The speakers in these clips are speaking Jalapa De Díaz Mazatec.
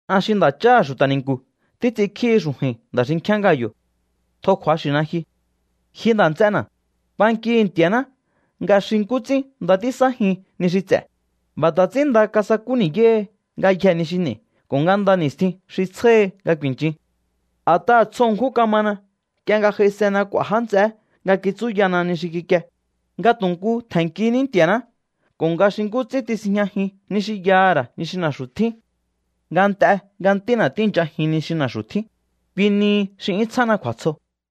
An xi nda̱cháha̱ xu̱ta̱ ni̱nku̱ títs'inkjíhi xu̱ju̱i̱n nda̱ xinkjíán Gayo̱. Tjo kju̱axi̱na ji. Ji nda̱ nts'ena̱, bankihi̱ Nti̱a̱ná nga xi nkú ts'ín nda tísájin ni xi ts'e̱, b'a̱ ta̱ ts'ín nda kasakú ni̱yáhi ngayjee̱ ni xi n'e̱i̱ ko̱ nga nda ni̱stjin xi tsjáhi nga ku̱i̱nchin. A̱t'aha̱ tsjo ṉkjún kamana nk'ie nga j'aisena k'u̱a̱ já nts'eé nga kitsúyana ni xi kikie, nga tu̱ nkú tje̱nnkiní Nti̱a̱ná ko̱ nga xi nkú ts'ín tisinjñajin ni xi yaha̱ ra̱ ni xi na̱xu̱ tjín. Nga nt'e nga ntína̱ tíi̱nchajin ni xi na̱xu̱ tjín, kui nihi xi 'yún tsjána kju̱a̱tsjo.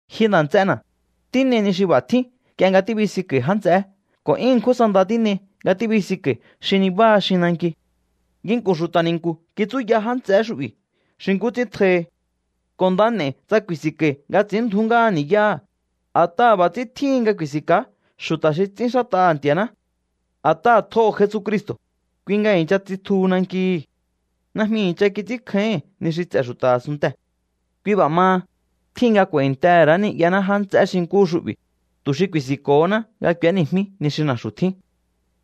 Ji nda̱ts'ena̱, tín'ei ni xi b'a̱ tjín nk'ie nga tíbisinko̱i̱ já nts'eé ko̱ 'yún ṉkjún sa nda tín'ei nga tíbisinko̱i̱ xi nibáha xin nanki. Nginku̱n xu̱ta̱ ni̱nku̱ kitsúya já nts'eé xu'bi̱ xi nkú ts'ín tjohi. Ko̱ nda n'e̱i̱ tsa ku̱i̱si̱nko̱i̱ nga ts'i̱ínndju̱ú ngáha ni̱yáha̱, a̱t'aha̱ b'a̱ ts'ín tjíhin nga ku̱i̱si̱nka̱á xu̱ta̱ xi ts'ínxát'aha̱ Nti̱a̱ná. A̱t'aha̱ tjoho̱ Jesucristo̱, kui nga i̱ncha tsitjuhu nankihi̱. Najmi i̱ncha kits'ínkjáíhi̱n ni xi ts'e̱ xu̱ta̱ a̱sunntee̱. Kui b'a̱ maha, tjíhin nga k'u̱a̱i̱ntehe̱ ra̱á ni'yaná já nts'eé xi nkúhu xu'bi̱, tu̱ xi ku̱i̱si̱nko̱honá nga k'u̱éni̱jmí ni xi na̱xu̱ tjín.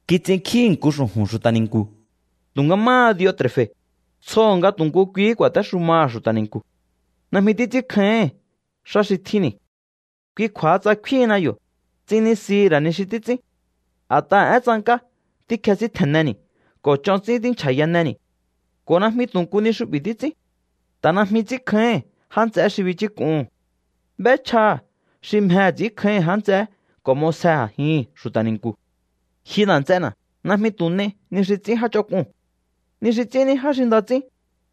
Kits'inkjíhi̱ nku xu̱ju̱n xu̱ta̱ ni̱nku̱, tu̱nga máha Diotre̱fe̱, tsjoho̱ nga tu̱ nku kuihí ku̱a̱téxumaha̱ xu̱ta̱ ni̱nku̱. Najmi títs'ínkjáíhi̱n xá xi tjínni̱. Kui kju̱a̱ha, tsa kfíhinna yo̱, ts'innisihi̱ ra̱ ni xi títs'ín. A̱t'aha̱ én tsank'á tíkjesíntje̱nneni̱ ko̱ ch'on ts'ín tínchja̱yaneni̱. Ko̱ najmi tu̱ nku ni xu'bi̱ xi títs'ín. Ta̱ najmi ts'ínkjáíhi̱n já nts'eé xi bichúk'uhu̱n. B'échjaha̱ xi mjehe̱ ts'i̱ínkjáíhi̱n já nts'eé ko̱ m'osje a̱jihi̱n xu̱ta̱ ni̱nku̱. Ji nda̱ nts'ena̱, najmi tu̱ n'ei ni xi ts'ín já ch'onk'uu̱n. Ni xi ts'ín ní já xi nda ts'ín,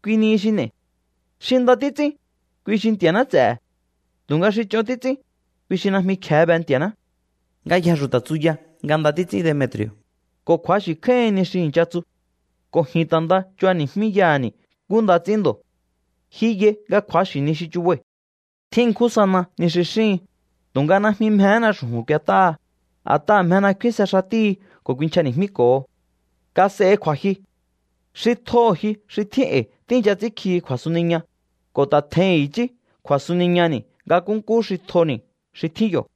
kui xi n'e̱i. Xi nda títs'ín, kui xi Nti̱a̱ná ts'e̱he̱. Tu̱nga xi ch'on títs'ín, kui xi najmi kje̱e be Nti̱a̱ná. Ngayjee̱ xu̱ta̱ tsuya nga nda títs'ín Demetri̱o̱, ko̱ kju̱axi̱ kjáíhin ni xi i̱ncha tsu. Ko̱ ji̱n ta̱ nda chubani̱jmíyaha̱ni̱ nkú nda ts'ín ndo̱. Ji yai nga kju̱axi̱ ni xi chubai̱. Tjín ṉkjún sana ni xi xíhin, tu̱nga najmi mjehéna xu̱ju̱n k'uet'áha, a̱t'aha̱ mjena kfínse xatíhi ko̱ kuinchjani̱jmíko̱ho. Kas'ehi kju̱a̱jyu. Xi tjoho̱ ji xi tjín e̱i̱ tíi̱ncha ts'ínkjihi kju̱a̱suniña, ko̱ ta̱ tje̱hi̱n i̱chí kju̱a̱suniñani̱ nga nkúnkú xi tjoni̱ xi tjín yo̱.